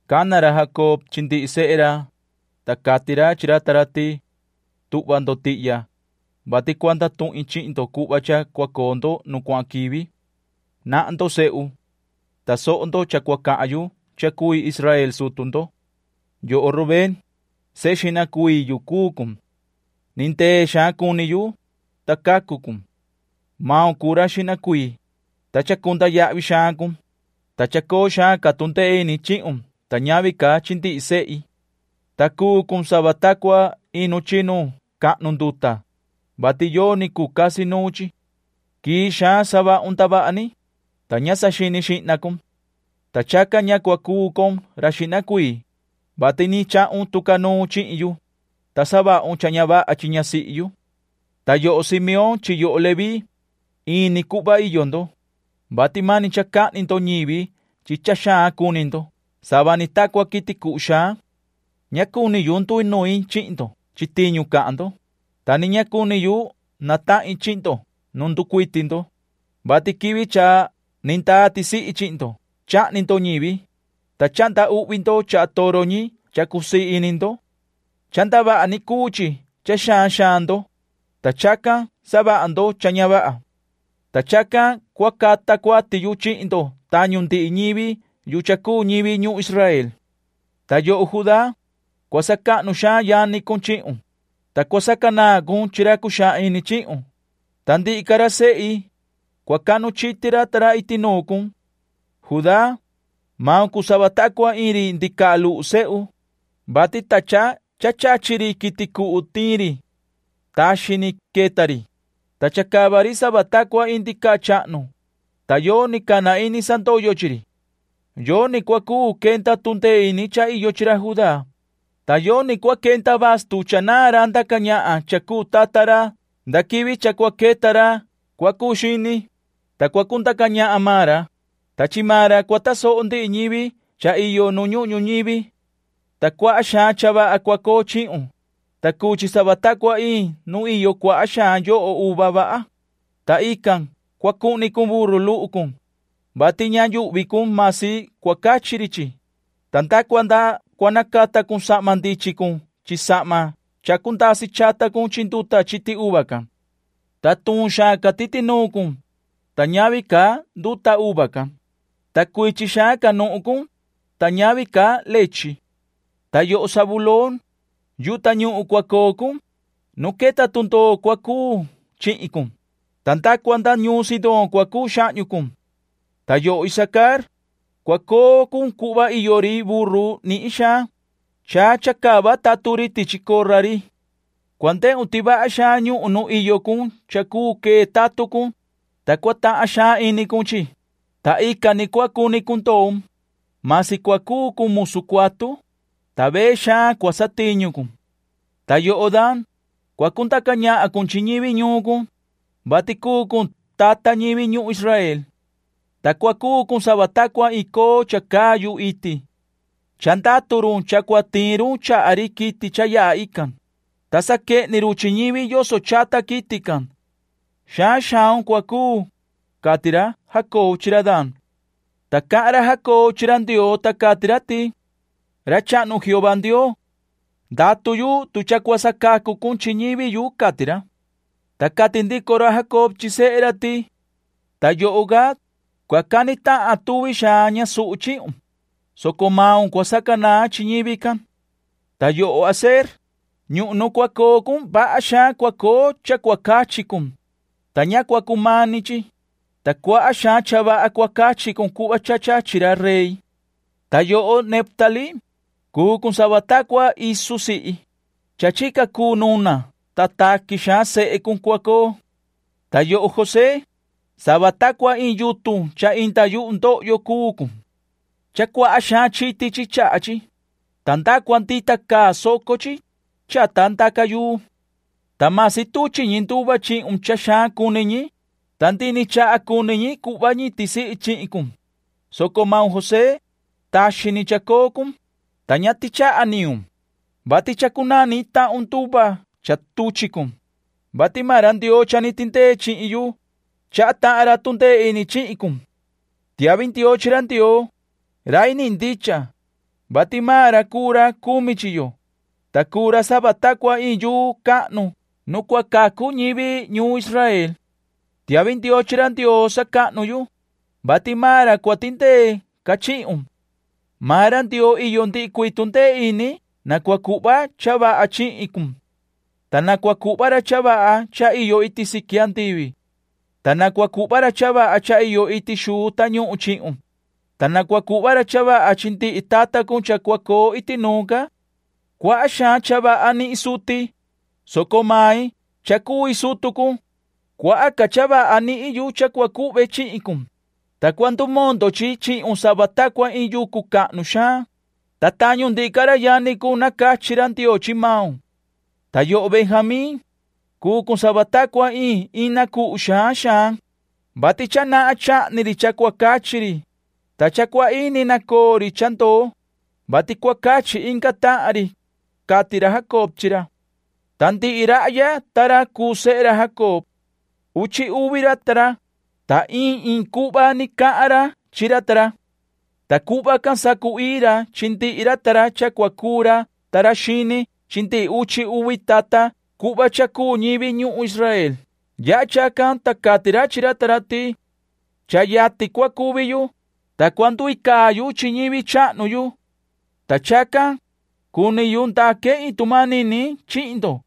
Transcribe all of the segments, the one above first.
Cana ra Jacob chi ndihi sehe ra, ta cati ra chi ra ta ra ti: “Tuhva ndo tihya, vati cua ndatuhin chihin ndo cuhva cha cua coo ndo nu cuahan quivi: “Nahan ndo, sehu. Tasoho ndo cha cua cahan yu cha cui Israel sutu ndo. “Yoho Rubén, sehe xihna cuii yu cuu cun. Ni ndee xaan cuni yu, ta cacu cun. Maun cuu ra xihna cuii, ta chacunda yahvi xaan cun, ta chacoo xaan ca tundee ini chihun ta ñavi ca chi ndihi sehi. Ta cuu cun sava ta cua iin nu chinu cahnu nduta, vati yoni cuu casi nuun chi. Quii xaan savahun ndavaha ni, ta ña saxini xihna cun. Ta chacan ña cua cuu con ra xihna cuii, vati ni chahun tucanuun chihin yu, ta savahun cha ña vaha chi ñasihi yu. “Ta yoho Simeón chi yoho Leví, in ni cuhva iyo ndo, vati mani cha cahni ndo ñivi chi cha xaan cuni ndo sava ni ta cua quiti cuhu xaan. Ña cuni yu nduinuin chihin ndo chi tiñu cahan ndo, ta ni ña cuni yu natahin chihin ndo nu nducuiti ndo, vati quivi cha ni ndaa tisihi chihin ndo chahni ndo ñivi, ta chahnda uhvi ndo chaha toro ñi cha cusii ini ndo. Cha ndavaha ni cuu chi cha xaan xaan ndo, ta chacan savaha ndo cha ña vaha. Ta chacan cua cata cuati yu chihin ndo tañu ndihi ñivi yu cha cuu ñivi ñuhun Israel. “Ta yoho Judá, cua sacahnu xaan yani cun chihun, ta cua sacanaan cun chi ra cuxaan ini chihun, ta ndihi ca ra sehi, cua cahnu chiti ra ta ra iti nuun cun. Judá, maun cuu sava ta cua iin ri ndicaha luhu sehu, vati ta cha cha chachi ri quiti cuhu tiin ri. Taxi ni queta ri, ta chacava ri sava ta cua iin ndicaha chahnu, ta yoni cana ini sandoyo chi ri. Yoni cua cuu quenda tundee ini cha iyo chi ra Judá, ta yoni cua quenda bastu cha naan ra ndaca ñahan cha cuu tata ra nda quivi cha cua queta ra cua cuu Xini, ta cua cundaca ñahan maan ra, ta chi maan ra cua tasoho ndihi ñivi cha iyo nu ñuhun ñuñivi. Ta cuaha xaan cha vaha cua coo chihun, ta cuu chi sava ta cua iin nu iyo cuaha xaan yoho uva vaha, ta ican cua cuhni cun burru luhu cun, vati ña yuhvi cun masi cua cachi ri chi, ta nda cua cua nacata cun sahma ndichin cun chi sahma chacu ndasi chata cun chi nduta chiti uva can. Ta tuun xaan ca titi nuun cun, ta ñavi ca nduta uva can, ta cuichi xaan ca nuhun cun, ta ñavi ca lechi. “Ta yoho Zabulón, yuhu tañuhun cua coo cun, nu queta tundoo cua cuu chihin cun, ta nda cua nda ñuun Sidón cua cuu xahñu cun. “Ta yoho Isacar, cua coo cun cuhva iyo ri burru nihin xaan, cha chacava tatun ri tichi corra ri. Cua ndehun ti vaha xaan ñuhun nu iyo cun cha cuu quee tatun cun, ta cua tahan xaan ini cun chi, ta ican ni cua cuni cun ndoun, masi cua cuu cun musu cuatu, ta vee xaan cua satiñu cun. “Ta yoho Dan, cua cundaca ñahan cun chi ñivi ñuun cun, vati cuu cun tata ñivi ñuhun Israel. Ta cua cuu cun sava ta cua iin coo cha caa yuhu iti. Cha ndatu run cha cua tiin run chaha ri quiti cha yaha ican, ta saquehni run chi ñivi yoso chata quiti can. Xaan xaun cua cuu”, cati ra Jacob chi ra Dan. Ta cahan ra Jacob chi ra Ndioo, ta cati ra ti: “¡Ra Chahnu Jehová Ndioo! Ndatu yu tu cha cua sacacu cun chi ñivi yu”, cati ra. Ta cati ndico ra Jacob chi sehe ra ti: “Ta yoho Gad, cua cani tahan tuvi xaan ñasuhu chihun, soco maun cua sacanaan chi ñivi can. “Ta yoho Aser, ñuhun nu cua coo cun vaha xaan cua coo cha cua cachi cun, ta ña cua cumani chi, ta cuaha xaan cha vaha cua cachi cun cuhva cha chachi ra rey. “Ta yoho Neftalí, cuu cun sava ta cua isu sihi, cha chica cuu nuna ta taqui xaan sehe cun cua coo. “Ta yoho José, sava ta cua iin yutun cha inda yuhu ndohyo cuu cun. Cha cuaha xaan chiti chi chaha chi, ta nda cua ndita caa soco chi, chata ndaca yuu. Ta masi tuchi ñi nduva chihun cha xaan cuni ñi, ta ndihi ni chaha cuni ñi cuhva ñi tisihi chihin cun, soco maun José, taxi ni chacoo cun, ta ña tichaha nihun, vati cha cunaan nihin tahun nduva cha tuchi cun, vati maan ra Ndioo cha ni tindee chihin yu, chaha tahan ra tundee ini chihin cun. ¡Tiahvi ndioo chi ra Ndioo, rai nihin ndicha, vati maan ra cuu ra cumi chi yo, ta cuu ra sava ta cua iin yuu cahnu nu cua cacu ñivi ñuun Israel! Tiahvi ndioo chi ra Ndioo sacahnu yu, vati maan ra cua tindee ca chihun. Maan ra Ndioo iyo ndihi cuii tundee ini na cua cuhva cha vaha chihin cun. Ta na cua cuhva ra cha vaha cha iyo iti siqui andivi. Ta na cua cuhva ra cha vaha cha iyo iti xuu tañuhun chihun, ta na cua cuhva ra cha vaha chi ndihi tata cun cha cua coo iti nuun ca. Cuaha xaan cha vaha nihin suti, soco mai cha cui sutu cun, cuaha ca cha vaha nihin yu cha cua cuhve chihin cun, ta cua ndumondo chi chihun sava ta cua iin yucu cahnu xaan, ta tañu ndihi ca ra yani cun nacachi ra Ndioo chi maun. “Ta yoho Benjamín, cuu cun sava ta cua iin ina cuhu xaan xaan, vati cha nahan chahni ri cha cua cachi ri, ta cha cua ini nacoo ri cha ndoo, vati cua cachi inga tahan ri”, cati ra Jacob chi ra. Ta ndihi rahya ta ra cuu sehe ra Jacob. Uchi uvi ra ta ra, ta iin iin cuhva ni cahan ra chi ra ta ra. Ta cuhva can sacu-ii ra chi ndihi ra ta ra cha cua cuu ra ta ra xini chi ndihi uchi uvi tata cuhva cha cuu ñivi ñuhun Israel. Yaha chacan, ta cati ra chi ra ta ra ti: “Cha yatin cua cuvi yu, ta cua nduicaa yu chi ñivi chahnu yu. Ta chacan, cuni yu ndaque iin tu manini chihin ndo,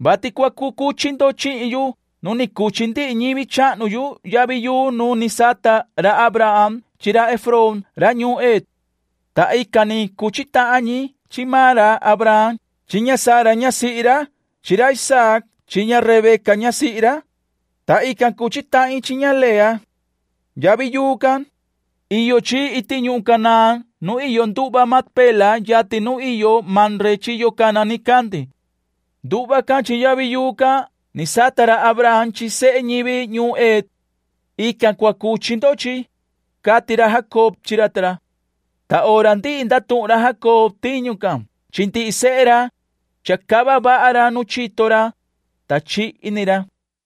vati cua cucuchi ndo chihin yu nu ni cuchi ndihi ñivi chahnu yu yavi yuu nu ni sata ra Abraham chi ra Efrón ra ñuun Het. Ta ican ni cuchi tahan ñi chi maan ra Abraham chi ña Sara ñasihi ra chi ra Isaac chi ña Rebeca ñasihi ra, ta ican cuchi tahin chi ña Lea. Yavi yuu can, iyo chi iti ñuhun Canaán nu iyo nduhva Macpela yatin nu iyo Mamre chiyo cana nicandi. Nduhva can chi yavi yuu can ni sata ra Abraham chi sehe ñivi ñuun Het. Ican cua cuchi ndo chi”, cati ra Jacob chi ra ta ra. Ta hora ndihi ndatuhun ra Jacob tiñu can chi ndihi sehe ra, chacava vaha ra nu chito ra, ta chihi ni ra.